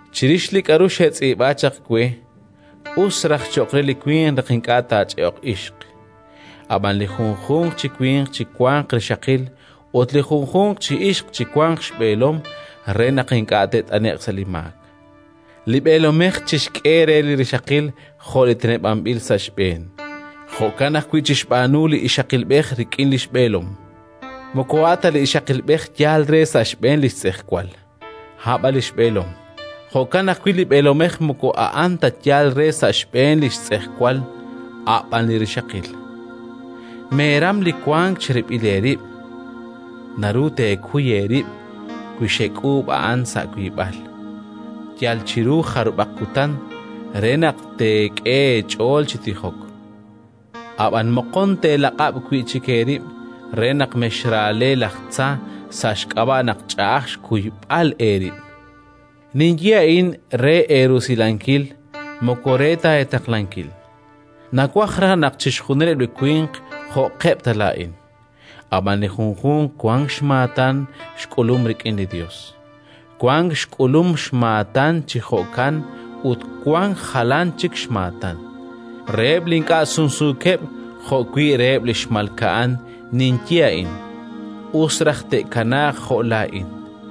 Chirix li k'aru xetz'iib'a chaq we, us raj cho'q re li winq naq ink'a' taach'e'oq ixq. Ab'an li junjunq chi winq chiwanq rixaqil ut li junjunq chi ixq chiwanq xb'eelom re naq ink'a' te't'ane'q sa' li maak. Li b'eelomej chixk'e re li rixaqil jo' li teneb'anb'il sa' xb'een; jo'kan ajwi' chixb'aanu li ixaqilb'ej rik'in li xb'eelom. Moko a' ta li ixaqilb'ej yaal re sa' xb'een li xtz'ejwal, a' b'an li xb'eelom. Jo'kan ajwi' li b'eelomej moko a'an ta yaal re sa' xb'een li xtz'ejwal, a' b'an li rixaqil. Meeram li wank cherib'il eerib'; naru teekuy eerib' wi xek'uub' a'an sa' wiib'al, yal chiru jarub'aq kutan, re naq teek'e eech'ool chi tijok. Ab'anan moqon teelaq'ab' wi' chik eerib' re naq mexraale laj tza sa' xk'ab'a' naq ch'a'aj xkuyb'al eerib'. Ninye a'in re eerusilankil, moko re ta eetaqlankil. Nawaj raj naq chixjunileb' li winq jo'qeb' ta laa'in. Ab'an li junjunq wank xmaatan xk'ulum rik'in li Yos: wank xk'ulum xmaatan chi jo'kan ut wank jalan chik xmaatan. Reheb' li ink'a' sumsuukeb' jo'wi' reheb' li xmalka'an ninye a'in: us raj te'kanaaq jo' laa'in.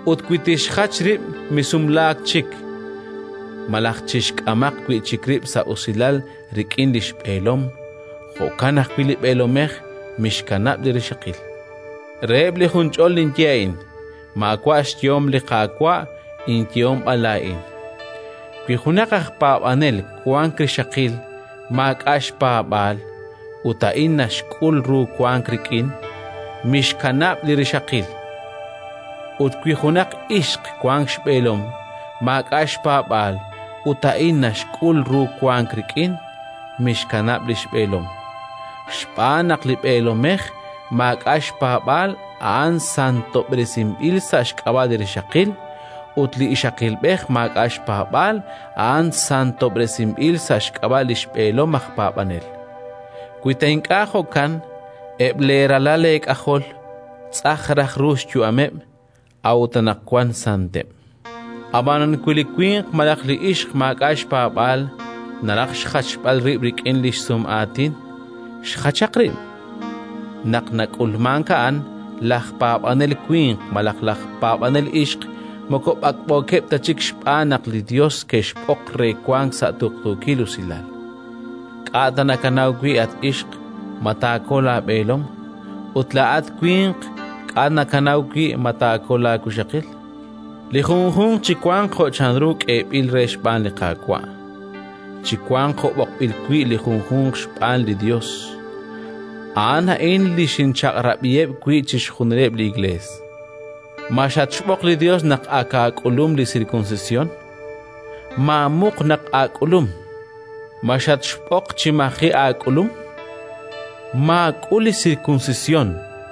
Ut wi tixjach rib', misumlaak chik, malaj chixk'amaq wi' chik rib' sa' usilal rik'in li xb'eelom. Jo'kan ajwi' li b'eelomej mixkanab' li rixaqil. Reheb' li junch'ol ninye a'in (maawa' xyehom li Qaawa', inyehom b'an laa'in): wi junaq aj paab'anel wank rixaqil maak'a' xpaab'aal ut a'in naxk'ul ru wank rik'in, mixkanab' li rixaqil. Ut wi junaq ixq wank xb'eelom maak'a' xpaab'aal ut a'in naxk'ul ru wank rik'in, mixkanab' li xb'eelom. Xb'aan naq li b'eelomej maak'a' xpaab'aal a'an santob'resinb'il sa' xk'ab'a' li rixaqil, ut li ixaqilb'ej maak'a' xpaab'aal a'an santob'resinb'il sa' xk'ab'a' li xb'eelom aj paab'anel. Wi ta ink'a' jo'kan, eb' leeralal eek'ajol tz'aj raj ru li xyu'ameb', a'ut anaqwan santeb'. Ab'anan wi li winq malaj li ixq maak'a' xpaab'aal naraj xjachb'al rib' rik'in li xsum'aatin, xjachaq rib': naq nak'ulmank a'an, laj paab'anel winq malaj laj paab'anel ixq moko b'ak'b'ookeb' ta chik, xb'aan naq li Yos kexb'oq re wank sa' tuqtuukil usilal. K'a' ta nakanaw wi', at ixq, ma taakol laab'eelom? Ut laa'at winq, k'a' ta nakanaw wi' ma taakol laawixaqil? Li junjunq chiwanq jo' chanru k'eeb'il re xb'aan li Qaawa'; chiwanq jo' b'oqb'il wi' li junjunq xb'aan li Yos. A'an a'in li ninchaq'rab'iheb' wi' chixjunileb' li Iklees. Ma xatxb'oq li Yos naq ak aak'ulum li sirkunsisyon? Maamuq naq aak'ulum. Ma xatxb'oq chi maji' aak'ulum? Maak'ul li sirkunsisyon.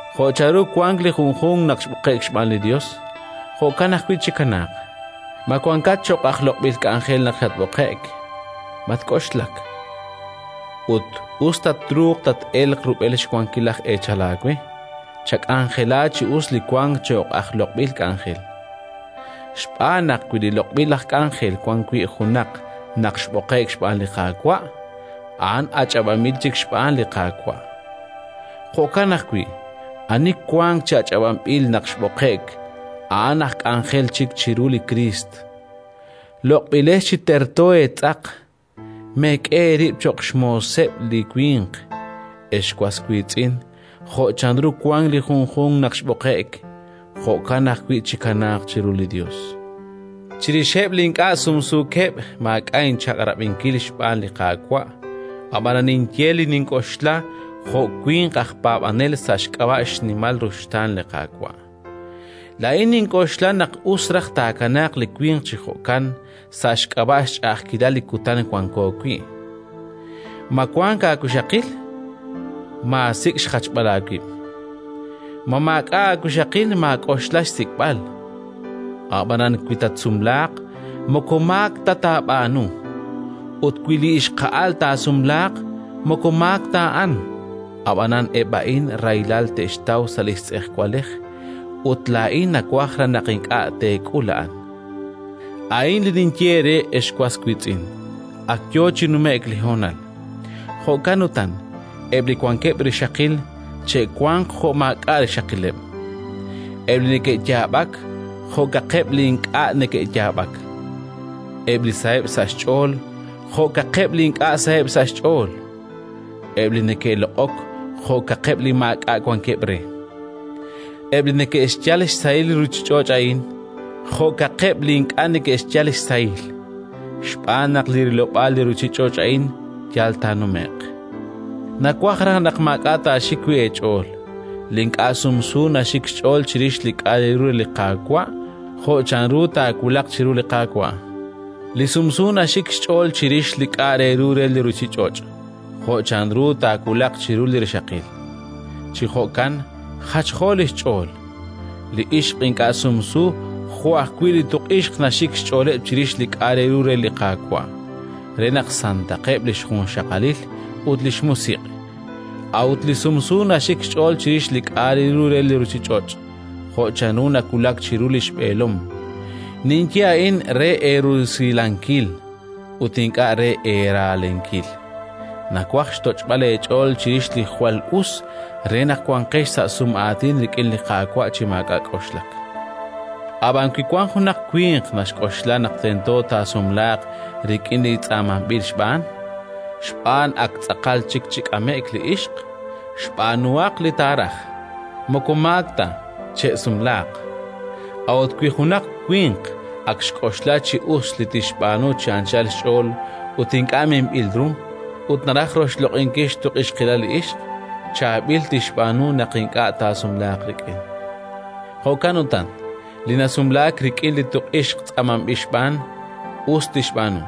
Jo' chanru wank li junjunq naq xb'oqe'k xb'aan li Yos, jo'kan ajwi' chikanaaq. Ma wankat cho'q aj loq'b'il k'anjel naq xatb'oqe'k? Matk'oxlak. Ut us ta truuq tat-elq rub'el xwankil laj eechal aawe, chak'anjela chi us li wank cho'q aj loq'b'il k'anjel. Xb'aan naq wi loq'b'il aj k'anjel wan wi' junaq naq xb'oqe'k xb'aan li Qaawa', a'an ach'ab'anb'il chik xb'aan li Qaawa'. Jo'kan ajwi' ani wank chi ach'ab'anb'il naq xb'oqe'k, a'an aj k'anjel chik chiru li Kriist. Loq'b'ilex chi terto eetz'aq! Meek'e eerib' cho'q xmooseb' li winq! Ex was wiitz'in, jo' chanru wank li junjunq naq xb'oqe'k, jo'kan ajwi' chikanaaq chiru li Yos. Chirixeb' li ink'a' sumsuukeb' maak'a' inchaq'rab'inkil xb'aan li Qaawa', ab'anan ninye li nink'oxla jo' winq aj paab'ajel sa' xk'ab'a' xnimal ruxtaan li Qaawa'. Laa'in nink'oxla naq us raj taakanaaq li winq chi jo'kan, sa' xk'ab'a' xch'a'ajkilal li kutan wanko wi'. Ma wank aawixaqil? Maasik' xjachb'al aawib'. Ma maak'a' aawixaqil? Maak'oxla xsik'b'al. Ab'anan wi tatsumlaaq, moko maak ta taab'aanu. Ut wi li ixqa'al taasumlaaq, moko maak ta a'an. Ab'anan eb' a'in rahilal te'xtaw sa' li tz'ejwalej, ut laa'in nawaj raj naq ink'a' teek'ul a'an. A'in li ninye eere, ex was wiitz'in: ak yo chi nume'k li honal. Jo'kan utan, eb' li wankeb' rixaqil che'wanq jo' maak'a' rixaqileb'. Eb' li neke'yaab'ak jo'kaqeb' li ink'a' neke'yaab'ak. Eb' li saheb' sa' xch'ool jo'kaqeb' li ink'a' saheb' sa' xch'ool. Eb' li neke'loq'ok jo'kaqeb' li maak'a' wankeb' re. Eb' li neke'xyal xsahil li ruuchich'och' a'in, jo'kaqeb' li ink'a' neke'xyal xsahil. Xb'aan naq li rilob'aal li ruuchich'och' a'in yal taanume'q. Nawaj raj naq maak'a' taaxik wi' eech'ool. Li ink'a' sumsu naxik xch'ool chirix li k'a' re ru re li Qaawa', jo' chanru taawulaq chiru li Qaawa'. Li sumsu naxik xch'ool chirix li k'a' re ru re li ruuchich'och', jo' chanru taawulaq chiru li rixaqil: chi jo'kan jachjo li xch'ool. Li ixq ink'a' sumsu jo' ajwi' li tuq'ixq naxik xch'ooleb' chirix li k'a' re ru re li Qaawa', re naq santaqeb' li xjunxaqalil ut li xmusiq'. A'ut li sumsu naxik xch'ool chirix li k'a' re ru re li ruuchich'och', jo' chanru taawulaq chiru li xb'eelom. Ninye a'in re eerusilankil, ut ink'a' re eera'lenkil. Nawaj xtoch'b'al eech'ool chirix li jwal us, re naq wanqex sa' sum'aatin rik'in li Qaawa' chi maak'a' k'oxlak. Ab'an wi wank junaq winq naxk'oxla naq tento taasumlaaq rik'in li tz'aamanb'il xb'aan, xb'aan ak tz'aqal chik chi k'ame'k li ixq, xb'aanuhaq li taaraj. Moko maak ta: che'sumlaaq. A'ut wi junaq winq ak xk'oxla chi us li tixb'aanu chi anchal xch'ool ut ink'a' minb'il ru, ut naraj roxloq'inkil xtuq'ixqilal li ixq, chaab'il tixb'aanu naq ink'a' taasumlaaq rik'in. Jo'kan utan, li nasumlaak rik'in li tuq'ixq tz'aamanb'il xb'aan, us tixb'aanu.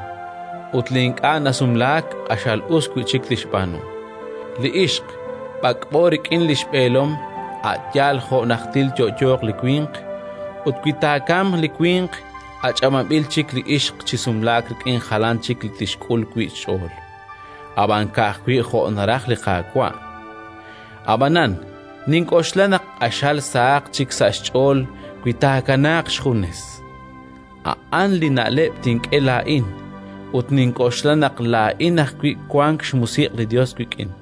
Ut li ink'a' nasumlaak, q'axal us wi' chik tixb'aanu. Li ixq, b'ak'b'o rik'in li xb'eelom a' yaal jo' najtil tyo'yooq li winq; ut wi taakamq li winq, ach'ab'anb'il chik li ixq chi sumlaak rik'in jalan chik li tixk'ul wi' xch'ool, ab'an ka'ajwi' jo' naraj li Qaawa'. Ab'anan nink'oxla naq q'axal sahaq chik sa' xch'ool wi taakanaaq xjunes: a'an li na'leb' nink'e laa'in; ut nink'oxla naq laa'in ajwi' wank xMusiq' li Yos wik'in.